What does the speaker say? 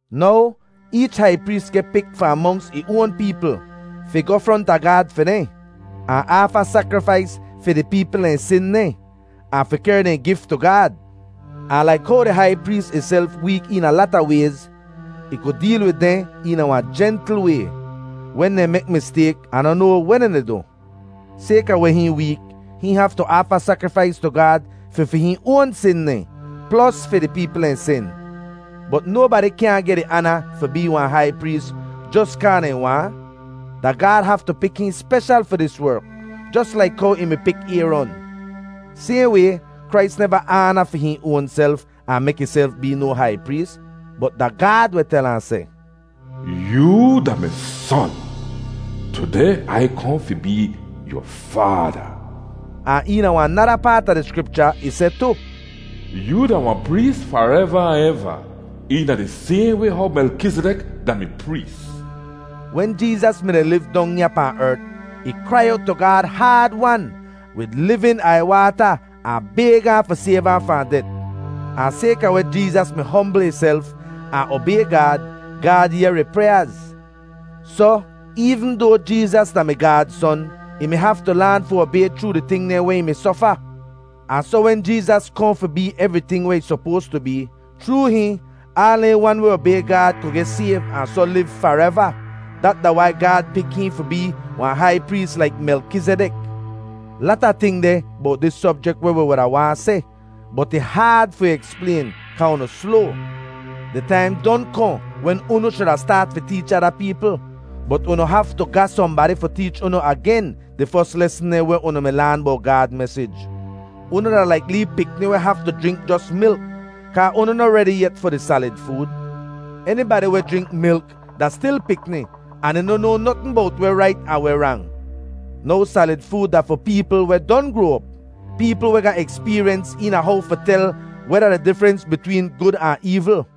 Now, eech hai prees geh pik fahn monks ih oan peepl, fi goh fronta Gaad fi dehn, ahn aafa sakrifais fi di peepl dehn sin dehn, ahn fi kehr dehn gif tu Gaad. Ahn laik how di hai prees ihself week eena lata wayz, ih ku deel wid dehn eena wahn jentl way, wen dehn mek mistayk ahn noh noa weh dehn di du. Sayka weh hihn week, hihn haftu aafa sakrifais tu Gaad fi fi hihn oan sin dehn, plos fi di peepl dehn sin. Bot nobadi kyaahn geh di aana fi bee wahn hai prees jos kaa dehn waahn; da Gaad haftu pik hihn speshal fi dis werk, jos laik how ih mi pik Ayron. Sayhn way, Krais neva aana fi hihn oanself ahn mek ihself bee no hai prees, bot da Gaad weh tel ahn seh, “Yoo da mi Son; tudeh Ai kohn fi bee yu Faada.” Ahn eena wahn nada paat a di Skripcha, ih seh tu, “Yoo da wahn prees fareva ahn eva, eena di sayhn way how Melkizidek da-mi prees.” Wen Jeezas mi-di liv dong ya pahn ert, ih krai owt tu Gaad haad-wan wid livin aiywaata ahn bayg ahn fi sayv ahn fahn det. Ahn sayka weh Jeezas mi hombl ihself ahn obay Gaad, Gaad yehr ih pryaaz. Soh, eevn doa Jeezas da-mi Gaad Son, ih mi haftu laan fi obay chroo di ting dehn weh ih mi sofa. Ahn soh wen Jeezas kohn fi bee evriting weh ih sopoas tu bee, chroo hihn, aal dehn wan weh obay Gaad ku geh sayv ahn soh liv fareva. Dat da wai Gaad pik hihn fi bee wahn hai prees laik Melkizidek. Lata ting deh bowt dis sobjek weh wi wuda waahn seh, bot ih haad fi eksplayn kaa unu sloa. Di taim don kohn wen unu shuda staat fi teech ada peepl, bot unu haftu ga sohnbadi fi teech unu agen di fos lesn dehn weh unu mi laan bowt Gaad mesij. Unu da laik lee pikni weh haftu jrink jos milk, kaa unu noh redi yet fi di salid food. Enibadi weh jrink milk da stil pikni, ahn dehn noh noa notn bowt weh rait ahn weh rang. Now salid food da fi peepl weh don groa op, peepl weh ga ekspeeryens eena how fi tel weh da di difrens bitween gud ahn eevl.